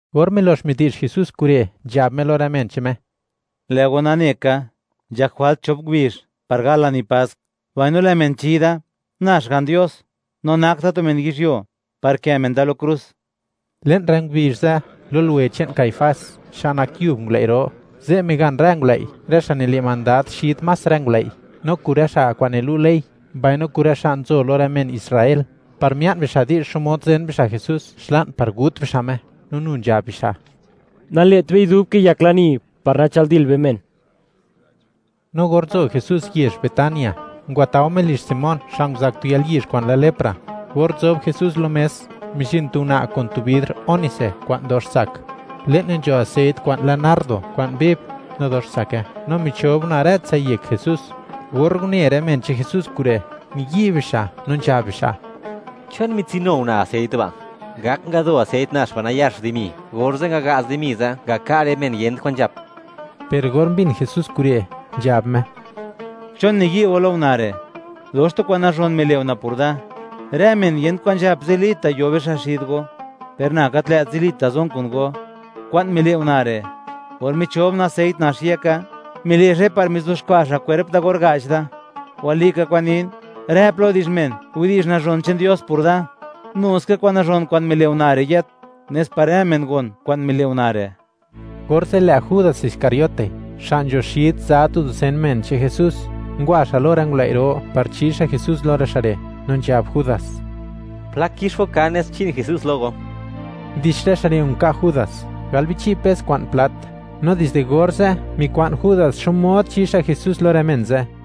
Or milox midi'zh Jesús kure', nzhab Me lo rë men che'n Me: ―Lë' go nane ka, nzhak jwalt chop ngubizh par gal lani Pask, mbaino lë' men chi da, na Xga'n Dios, no nak da tu men yizhyuo, par kë' men da lo krus. Le'n rë ngubizh ze', lo luwe che'n Caifás, xa' nak yub ngulëi' ro, ze' migan rë ngulëi', rë xa' nile' mandad xid más rë ngulëi', no kun rë xa' kwa'n nilu' ley, mbaino kun rë xa' nzo lo rë men Israel, par mia'n bixa' di'zh xmod zen bixa' Jesús xla'n par gut bixa' Me, no nu nzhab bixa': ―Nale't bei dub kiyak lani, par nachëldil be men. No or nzo Jesús yezh Betania, ngwatao Me lizh Simón xa' nguzak tu yalyizh kwa'n lë lepra. Or nzob Jesús lo mes, mizhin tu una' kun tu bidr ónice kwa'n dox tsak; le'ne nzho aseit kwa'n lë nardo kwa'n viv, no dox tsake, no michob una' rëtsai yek Jesús. Or une rë men che'n Jesús kure', niyi' bixa', no nzhab bixa': —¿Chon mitsinu una' aseit ba'? Ngak ngado aseit nax ba' nayax dimi, orze' ngaga'z dimi ze', ngaka' rë men yent kwan nzhap. Per or mbin Jesús kure', nzhab Me: ―¿Chon niyi' go lo una' re'? Dox tu kwa'n nazhon mile' una' por da; rë men yent kwan nzhap, zilita' yo bixa' xid go, per na gat lë't zilita' zon kun go. Kwa'n mile' una' re', or michob una' aseit nax yeka, mile' xa'i par mizuxkwa' xa' kwerp da or ga'ch da. Walika kwa'n nin; rë plo di'zh men widi'zh nazhon che'n Dios por da, nu ska kwa'n nazhon kwa'n mile' una' re' yët, nes par rë men gon kwa'n mile' una' re'. Orze', lë' Judas Iscariote, xa' nzho xid za tu dusen men che'n Jesús, ngwa xa' lo rë ngulëi' ro, par chi xa' Jesús lo rë xa' re', no nzhab Judas: ―¿Plak kix go kan nes chi'n Jesús lo go? Undix rë xa' re' nka' Judas, gal bichi' pes kwa'n plat, no dizde orze', mikwa'n Judas xmod, chi xa' Jesús lo rë men ze'.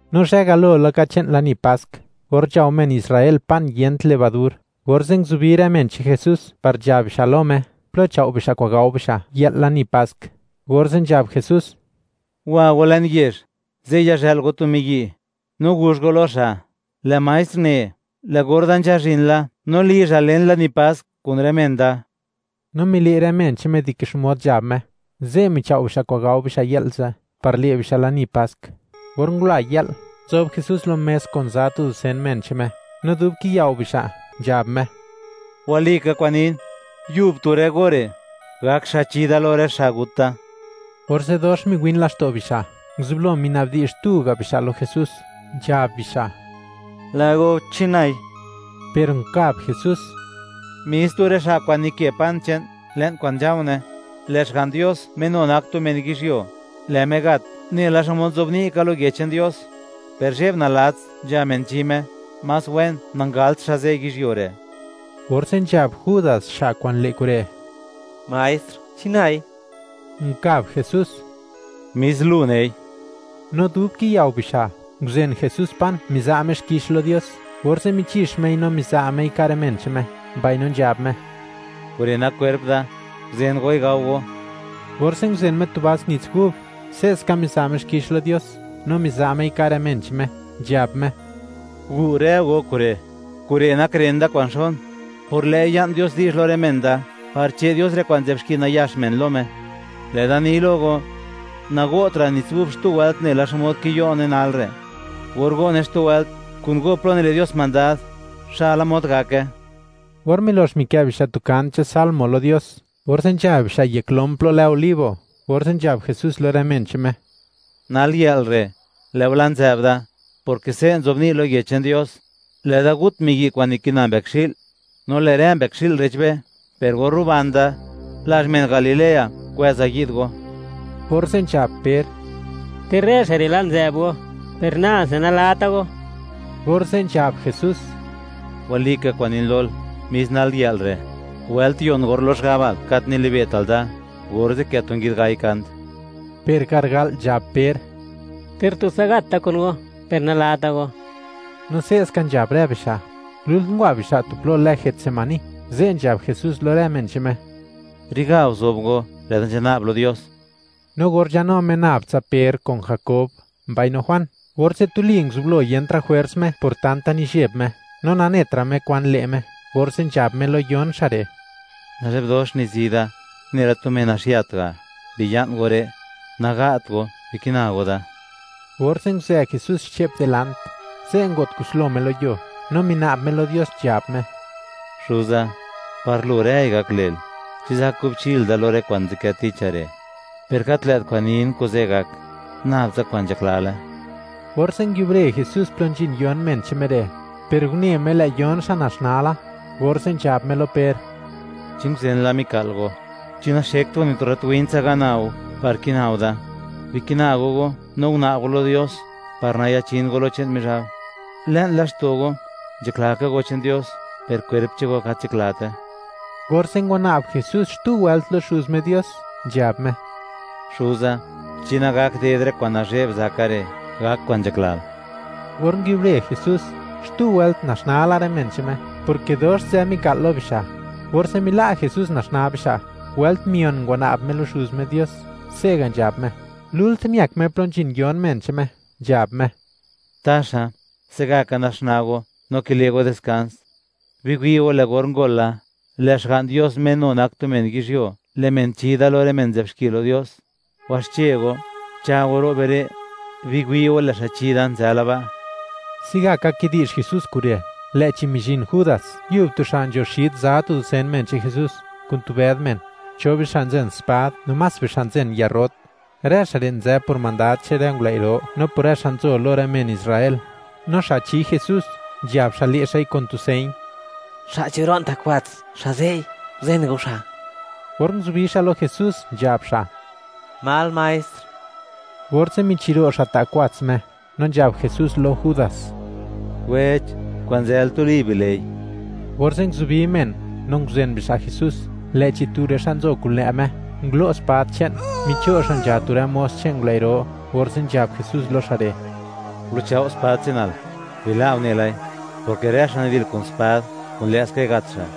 No zhë galo laka che'n lani Pask, or nzhao men Israel pan yent levadur, orze' nguzubi rë men che'n Jesús, par nzhab bixa' lo Me, plo chao' bixa' kwa'n gao bixa' yë'l lani Pask. Orze' nzhab Jesús: ―Wa go le'n yezh; ze' yazhë'l go tu miyi', no guzh go lo xa': “Lë' Maestr ne: Lë' or da nzhazhin la, no lizhal len lani Pask kun rë men da.” No mile' rë men che'n Me dike xmod nzhab Me; ze' michao' bixa' kwa'n gao bixa' yë'l ze', par le' bixa' lani Pask. Or ngula yë'l, nzob Jesús lo mes kun za tu dusen men che'n Me, no dub kiyao bixa', nzhab Me: ―Walika kwa'n nin, yub tu rë go re', gak xa' chi da lo rë xa' gut da. Orze' dox miwin laxto' bixa', nguzublo mina'bdi'zh tu ga' bixa' lo Jesús, nzhab bixa': ―Lë' go, ¿chi nai? Per nkab Jesús: ―Mis tu rë xa' kwa'n nikë pan che'n le'n kwa'n nzha̱u̱ne. Lë' Xga'n Dios Me nu nak tu men yizhyuo, lë' Me gat nela xmod nzobni' ka lo Yech che'n Dios, per, ¡zhe'b nalats nzha men chi Me! Más wen nangalt xa' ze' yizhyuo re'. Orze' nzhab Judas, xa' kwa'n le' kure': ―Maestr, ¿chi nai? Nkab Jesús: ―Mis lu nei. No dub kiyao bixa', nguzen Jesús pan, miza' Me xkix lo Dios, orze' michix Mei, no miza' Mei, ka' rë men che'n Me, mbaino nzhab Me: ―Kure' nak kwerp da; guzen goi, gao go. Orze' nguzen Me tu vas nits gub; se'ska miza' Me xkix lo Dios, no miza' Mei, ka' rë men che'n Me, nzhab Me: ―Gu' rë go kure'; kure' nak ren da kwa'n xon; por lë'i ya'n Dios di'zh lo rë men da par che' Dios rë kwa'n nzë'b xki nayax men lo Me. Lë' da ni lo go, nago'tra' nits gub xtu wëlt nela xmod kiyo'ne nalre'; or go'ne xtu wëlt kun go plo nile' Dios mandad, xa'la mod gake. Or milox mikë' bixa' tu kant che'n Salmo lo Dios, orze' nzha bixa' yek lom plo lë Olivo, orze' nzhab Jesús lo rë men che'n Me: ―Nal yë'l re', lë'u la' nzë'b da, porke se' nzobni' lo Yech che'n Dios: “Lë'da gut miyi' kwa'n nikina mbëkxi'l, no lë' rë mbëkxi'l re'chbe.” Per or ruban da, lazh men Galilea kwëza yi'd go. Orze' nzhab Per: ―Ter rë xa' re', la' nzë'b go, per nase, nalata go. Orze' nzhab Jesús: ―Walika kwa'n nin lol, mis nal yë'l re', wëlt yon or lox gabal gat nili'be'tal da, orze' kë' tu nguid gai kant. Per garga'l nzhab Per: ―¡Ter tutsa gat da kun go, per nalata go! No se'ska nzhab rë bixa'. Lult ngwa bixa' tu plo lë Getsemaní, ze' nzhab Jesús lo rë men che'n Me: ―Re'ga guzob go; lë' da nzhana'b lo Dios. No or nzhanu Me nab tsa Per, kun Jakob, mbaino Juan, orze' tuli nguzublo niyentra' jwers Me por tanta nizheb Me, no netra' Me kwan le' Me, orze' nzhab Me lo yon xa' re': ―Nazhe'b dox nizi da, nela tu men naxiat ga'; biya'n go re', naga't go; bikina go da. Orze' nguzë Jesús xche'p dilant; ze' ngo't kuslo Me lo yuo, no mina'b Me lo Dios, nzhab Me: ―Xuza, par Lu rëi gak le'l. ¿Chi zak kubchil da lo rë kwa'n nzadkë ticha re'? Per gat lë't kwa'n nin kuze' gak, nab tsa kwa'n nzhaklale. Orze' nguiubre Jesús plo nzhin yon men che'n Me re'; per une Me, lë' yon xa' naxnaa la. Orze' nzhab Me lo Per: ―¿Chi nguzen la mika'l go? ¿Chi naxekt go ni tu rrat win tsa, ga'na go par kina go da? Bikina go go no guna'b go lo Dios, par nayachin go lo che'n Mizhab. Le'n laxto' go nzhakla ka go che'n Dios, per kwerp che'n go gat nzhaklate. Orze' ngwana'b Jesús xtu wëlt lo Xuz Me Dios, nzhab Me: ―Xuza, chi nagak ded rë kwa'n nazhe'b zaka re', gak kwa'n nzhaklal. Or nguiubre Jesús, xtu wëlt naxnaa la rë men che'n Me, porke dox nzë mika'l lo bixa'. Orze' mila' Jesús naxnaa bixa', wëlt mion ngwana'b Me lo Xuz Me Dios, se'ga' nzhab Me. Lult miëk Me plo nzhin yon men che'n Me, nzhab Me: ―¿Taxa, se' gaka naxnaa go no kile' go diskans? Biwi' go, lë' or ngol la, lë' Xga'n Dios, Me nu nak tu men yizhyuo, lë' men chi Da lo rë men nzë'b xki lo Dios. Waxche go, cha' go, ro' be re'; biwi' go, lë' xa' chi da nzë la ba'. Se'gaka kidi'zh Jesús kure', lë'chi mizhin Judas, yub tu xa' nzho xid za tu dusen men che'n Jesús, kun tu bëd men; cho bixa' nzen spad no más bixa' nzen yarrot. Rë xa' re' nzë por mandad che'n rë ngulëi' ro no por rë xa' nzo lo rë men Israel. No xa' chi Jesús, nzhab xa', le' xa'i kun tu señ: “Xa' chiro'n ta' kwats, xa' ze'i, guzen go xa'.” Or nguzubi xa' lo Jesús, nzhab xa': ―¡Mal maestr! Orze' michiro' xa' ta' kwats Me, no nzhab Jesús lo Judas: ―Wech, kwa'n nzël, tuli bile'i. Orze' nguzubi men, no nguzen bixa' Jesús, lë'chi tu rë xa' nzo kun lë' Me, ngulo' spad che'n, micho' xa' nzha tu rë mos che'n ngulëi' ro, orze' nzhab Jesús lo xa' re': ―Gulu'chao' spad che'nal, ¡bila'o unelai!, porke rë xa' nidil kun spad, kun lë'skai gat xa'.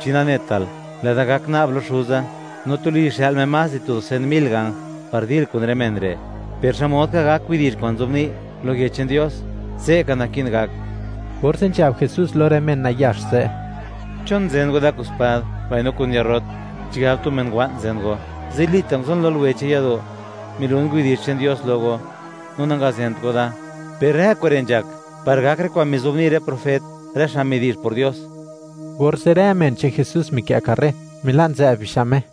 ¿Chi nanetal, lë'da gak na'b lo Xuza, no tuli xë'l Me más di tu dusen mil ganj, par dil kun rë men re'? Per, ¿xmod ka gak widi'zh kwa'n nzobni' lo Yech che'n Dios, se'ka naki'n gak? Orze' nzhab Jesús lo men nayax ze': ―¿Chon nzë go kun spad mbaino kun yarrot? ¿Chigab tu men wa'n zen go? Zilita' nguzon lo luwe che'n yado', milun widi'zh che'n Dios lo go, no nangazent go da. Per rë kure' nzhak par gak rë kwa'n mizobni' rë profet, rë xa' midi'zh por Dios. Orze', rë men che'n Jesús mikë' karre, mila' nzë'b bixa' Me.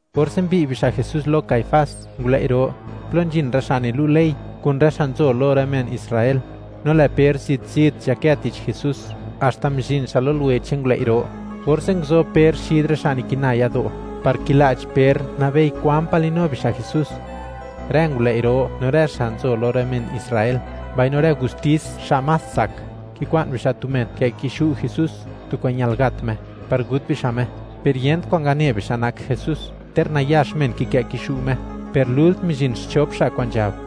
Orze' mbi'y bixa' Jesús lo Caifás, ngulëi' ro; plo nzhin rë xa' nilu' ley, kun rë xa' nzo lo rë men Israel. No lë' Per zit-zit nzhakë tich Jesús, haxta mizhin xa' lo luwe che'n ngulëi' ro. Orze' nguzob Per xid rë xa' nikina yado', par kila'ch Per, nabei kwan pa' li'nu bixa' Jesús. Rë ngulëi' ro, no rë xa' nzo lo rë men Israel, mbaino rë gustis xa' más tsak, kikwa'n bixa' tu men, kë' kixu' Jesús, tu kwa'n ñal gat Me, par gut bixa' Me. Per yent kwan ngane bixa' nak Jesús, ter nayax men kikë' kixu' Me. Per lult mizhin xchop xa' kwa'n nzhab: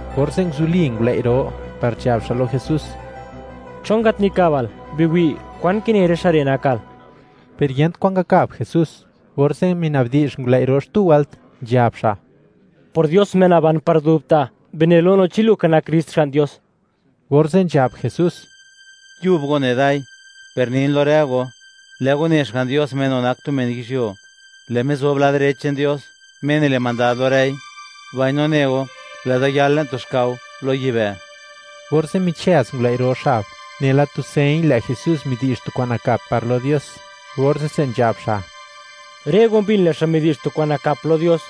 Orze' nguzuli ngulëi' ro, par nzhab xa' lo Jesús: ―¿Chon gat nikabal? Biwi', kwan kine rë xa' re' nakal. Per yent kwa'n ngakab Jesús. Orze' minabdi'zh ngulëi' ro xtu wëlt, nzhab xa': ―Por Dios, Me naban par dubta', bine lo no, chi lu ka nak Krist, Xga'n Dios. Orze' nzhab Jesús: ―Yub go ne dai. Per nin lo rë go, lë' go ne, Xga'n Dios, Me nu nak tu men yizhyuo; lë' Me zob lad direch che'n Dios, Me nile' mandad lo rëi; mbaino ne go, lë' da yal le'n tu xkao lo yibë'. Orze' michëz ngulëi' ro xab, nela tu señ, lë' Jesús midi'zh tu kwa'n nakap par lo Dios. Orze'se nzhab xa': ―Rë go mbin, lë' xa' midi'zh tu kwa'n nakap lo Dios.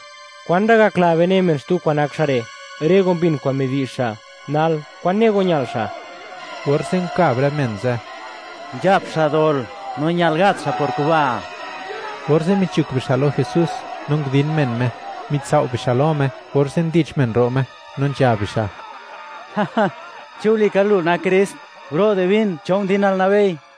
¿Kwan ra' gakla be, ne men, xtu kwa'n nak xa' re'? Rë go mbin kwa'n midi'zh xa'. Nal, ¿kwan ne go ñal xa'? Orze' nkab rë men ze': ―Nzhap xa' dol, no ñal gat xa' por kuba'. Orze' michuk bixa' lo Jesús, no ndin men Me; mitsao' bixa' lo Me orze' ndich men ro' Me, no nzhab bixa': ―Chi walika lu nak Krist, ¡guro' divin cho ndinal, nabei!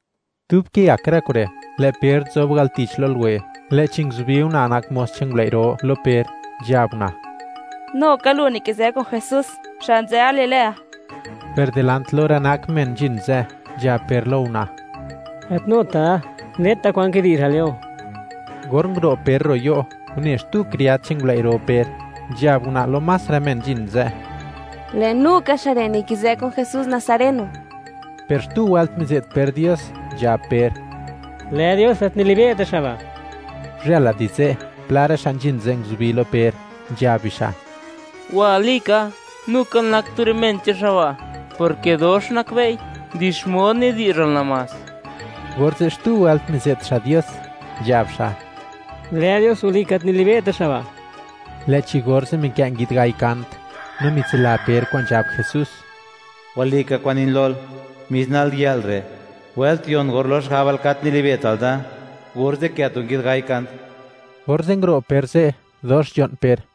Dub kiyak rë kure', lë' Per nzob al tich, lo luwe, lë'chi nguzubi una' nak mos che'n ngulëi' ro lo Per, nzhab una': ―Nu ka lu, nikizë' kun Jesús, xa' nzë Galilea. Per dilant lo rë nak men nzhin ze', nzhab Per lo una': ―¡Gat nuta' da! ¡Neta kwan kidi'zhal you! Or nguro' Per ro' yo', une xtu kriad che'n ngulëi' ro Per, nzhab una' lo más rë men nzhin ze': ―¡Lë' nu ka xa' re', nikizë kun Jesús Nazareno! Per xtu wëlt mize't Per Dios, nzhab Per: ―Lë Dios, gat nilibe'ta' xa' ba'. Guzhëla di ze', pla rë xa' nzhin ze' nguzubi lo Per, nzhab bixa': ―¡Walika, nukal nak tu rë men che'n xa' ba', porke dox nakbe'i di xmod nidi'zhal namás! Orze' xtu wëlt mize't xa' Dios, nzhab xa': ―¡Lë Dios, walika, gat nilibe'ta' xa' ba'! Lë'chi orze' mikë' nguid gai kant. No mitsila Per kwa'n nzhab Jesús: “Walika kwa'n nin lol, mis nal yë'l re', wëlt yon or lox gabal gat nili'be'tal da, orze' kë' tu nguid gai kant.” Orze' nguro' Per ze', dox nzho'n Per.